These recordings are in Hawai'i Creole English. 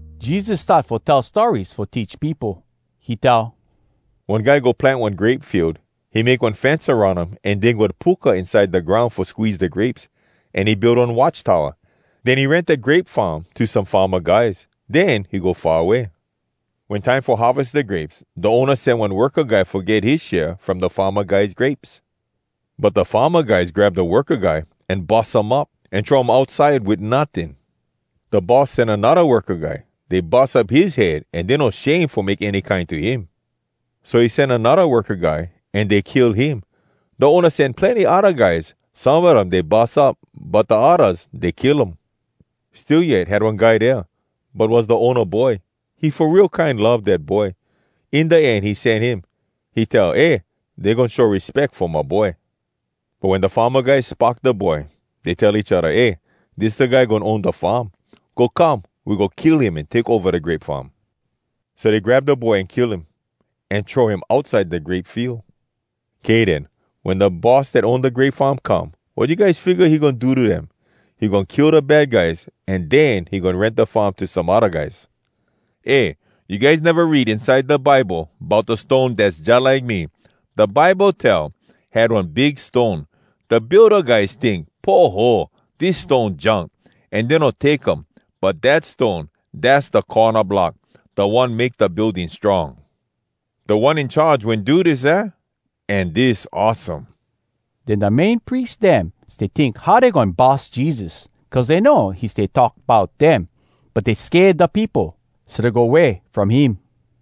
Jesus start fo tell stories fo teach peopo. He tell, “One guy go plant one grape field. He make one fence aroun um, an dig one puka inside da groun fo squeeze da grapes. An he build one watch towa. Den he rent da grape farm to some farma guys, den he go far away. “Wen time fo harves da grapes, da owna sen one worka guy fo get his share from da farma guys grapes. But da farma guys grab da worka guy, an bus um up, an throw him outside wit notting. Da boss sen anodda worka guy. Dey bus up his head an dey no shame fo make any kine to him. So he sen anodda worka guy, an dey kill him. Da owna sen plenny odda guys. Some a dem dey bus up, but da oddas, dey kill um. “Still yet had one guy dea, but was da owna boy. He fo real kine love dat boy. In da end he sen him. He tell, ‘Eh, dey goin show respeck fo my boy.’ “But wen da farma guys spock da boy, dey tell each odda, ‘Eh, dis da guy goin own da farm. Go come, we go kill him an take ova da grape farm.’ So dey grab da boy an kill him, an throw him outside da grape field. “Kay den, wen da boss dat own da grape farm come, wat you guys figga he goin do to dem? He goin kill da bad guys, an den he goin rent da farm to some odda guys. Eh, you guys neva read inside da Bible bout da stone dass jalike me? Da Bible tell, “‘Had one big stone, Da builda guys tink, “Poho! Dis stone junk!” An dey no take um. But dat stone, Dass da corna block. Da one make da building strong. Da One In Charge Wen do dis, aah? An dis awesome!’” Den da Main Pries dem stay tink how dey goin bus Jesus, cuz dey know he stay talk bout dem. But dey sked da peopo. So dey go way from him.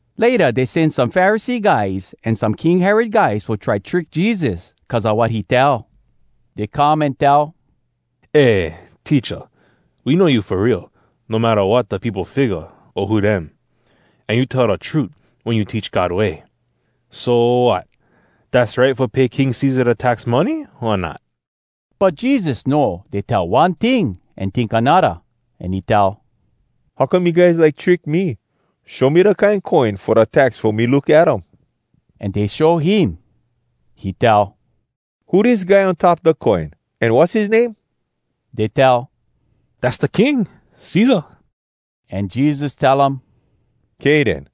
Layta dey sen some Pharisee guys an some King Herod guys fo try trick Jesus cuz a wat he tell. Dey come an tell, “Eh, Teacha, we know you fo real, no matta wat da peopo figga o who dem. An you tell da trut wen you teach God way. So, wat? Dass right fo pay King Cesar da tax money, o not?” But Jesus know dey tell one ting an tink anodda, an he tell, “How come you guys like trick me? Show me da kine coin fo da tax fo me look at um.” An dey show him. He tell, “Who dis guy on top da coin? An wass his name?” Dey tell, “Dass da King, Cesar.” An Jesus tell um, “Kay den.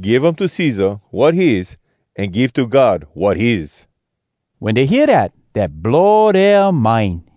Give um to Cesar, wat his, an give to God, wat his!” Wen dey hear dat, dat blow dea mind.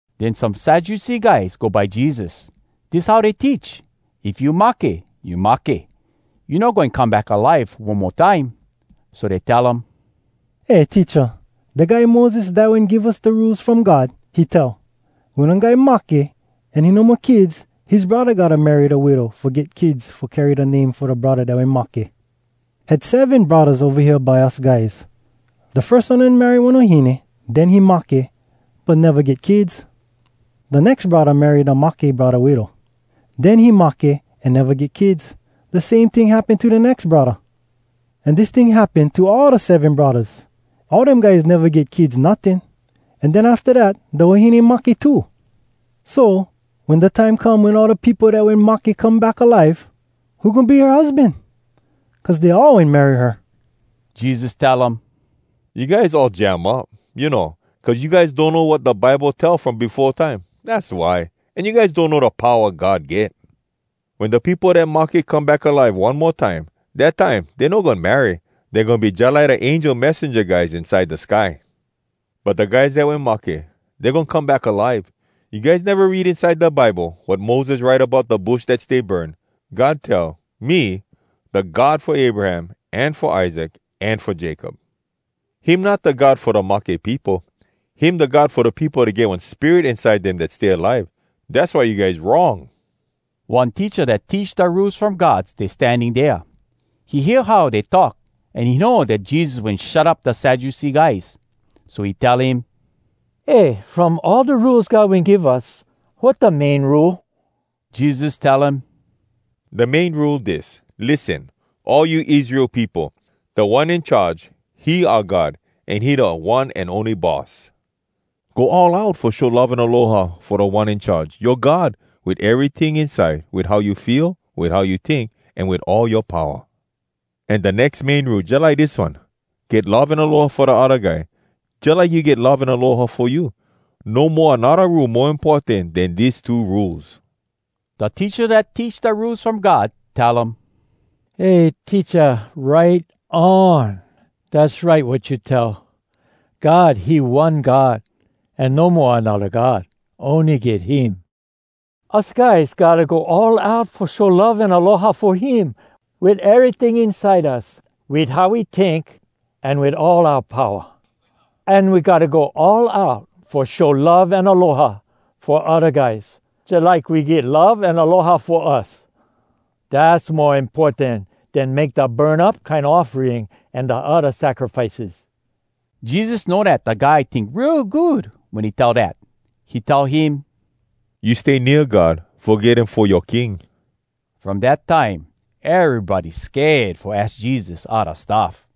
Den some Sadducee guys go by Jesus. Dis how dey teach: If you mahke, you mahke, you no goin come back alive one mo time. So dey tell um, “Eh, Teacha! Da guy Moses dat wen give us da Rules From God, he tell, ‘Wen one guy mahke an he no mo kids, his braddah gotta marry da widow fo get kids fo carry da name fo da braddah dat wen mahke.’ Had seven braddahs ova hea by us guys. Da firs one wen marry one wahine, den he mahke, but neva get kids. Da nex braddah marry da mahke braddah widow. Den he mahke, an neva get kids. Da same ting happen to da nex braddah. An dis ting happen to all da seven braddahs. All dem guys neva get kids notting. An den afta dat, da wahine mahke too. “So, wen da time come wen all da peopo dat wen mahke come back alive, who goin be her husban? Cuz dey all wen marry her.” Jesus tell um, “You guys all jam up, you know. Cuz you guys donno wat da Bible tell from befo time, az why, an you guys donno da powa God get. Wen da peopo dat mahke come back alive one mo time, dat time dey no goin marry. Dey goin be jalike da angel messenja guys inside da sky. But da guys dat wen mahke, dey goin come back alive. You guys neva read inside da Bible wat Moses write bout da bush dat stay burn? God tell, ‘Me, da God fo Abraham, an fo Isaac, an fo Jacob.’ Him not da God fo da mahke peopo. Him da God fo da peopo dat get one spirit inside dem dat stay alive. Dass why you guys wrong!” One teacha dat teach da Rules From God stay standing dea. He hear how dey talk, an he know dat Jesus wen shut up da Sadducee guys. So he tell him, “Eh, from all da Rules God wen give us, wat da main Rule?” Jesus tell him, “Da main Rule dis: ‘Lissen, all you Israel peopo! Da One In Charge, he oua God, an he da one an ony Boss. Go all out fo show love an aloha fo Da One In Charge, yoa God, wit eryting inside, wit how you feel, wit how you tink, an wit all yoa powa.’ An da nex main Rule jalike dis one, ‘Get love an aloha fo da odda guy jalike you get love an aloha fo you.’ No mo anodda Rule mo importan den dis two Rules.” Da teacha dat teach da Rules From God tell um, “Eh, Teacha, right on! Dass right wat you tell, ‘God, he one God, an no mo anodda God. Ony get him.’ Us guys gotta go all out fo show love an aloha fo him wit eryting inside us, wit how we tink, an wit all oua powa. An we gotta go all out fo show love an aloha fo odda guys jalike we get love an aloha fo us. Dass mo importan den make da burn up kine offering an da odda sacrifices.” Jesus know dat da guy tink real good wen he tell dat. He tell him, “You stay nea God, fo get him fo yoa King.” From dat time, erybody sked fo aks Jesus odda stuff.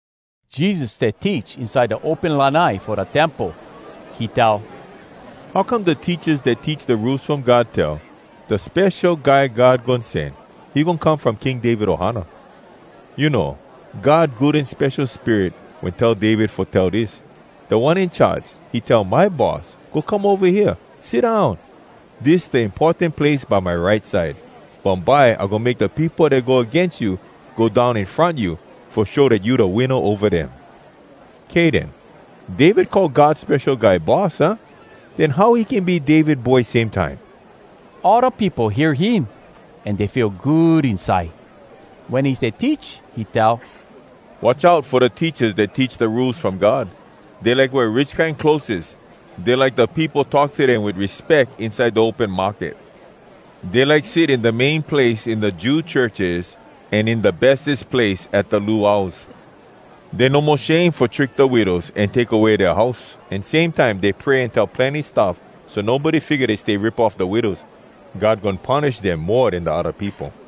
Jesus stay teach inside da open lanai fo da temple. He tell, “How come da teachas dat teach da Rules From God tell, ‘Da Spesho Guy God Goin Sen, he goin come from King David ohana’? You know, God Good An Spesho Spirit wen tell David fo tell dis: “‘Da One In Charge, He tell my Boss, “Go come ova hea, sit down! Dis da importan place by my right side. Bumbye I goin make da peopo dat go agains you Go down in front you, Fo show dat you da winna ova dem.” ’ “Kay den. David call God Spesho Guy ‘Boss,’ aah? Den how he can be David boy, same time?” All da peopo hear him, an dey feel good inside. Wen he stay teach, he tell, “Watch out fo da teachas dat teach da Rules From God! Dey like wear rich kine clotheses. Dey like da peopo talk to dem wit respeck inside da open market. Dey like sit in da main place in da Jew churches, an in da bestes place at da luaus. Dey no mo shame fo trick da widows an take away dea house, an same time dey pray an tell plenny stuff, so nobody figga dey stay rip off da widows. God goin punish dem mo den da odda peopo.”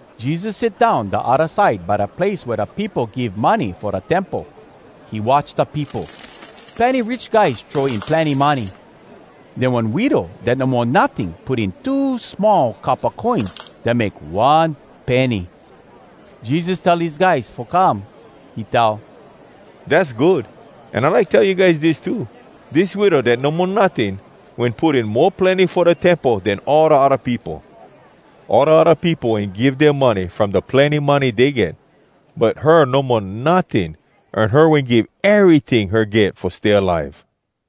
Jesus sit down da odda side by da place wea da peopo give money fo da temple. He watch da peopo. Plenny rich guys throw in plenny money. Den one widow dat no mo notting put in two small coppa coins dat make one penny. Jesus tell his guys fo come. He tell, “Dass good! An I like tell you guys dis too: Dis widow dat no mo notting wen put in mo plenny fo da Temple den all da odda peopo. All da odda peopo wen give dea money from da plenny money dey get. But her no mo notting, an her wen give eryting her get fo stay alive.”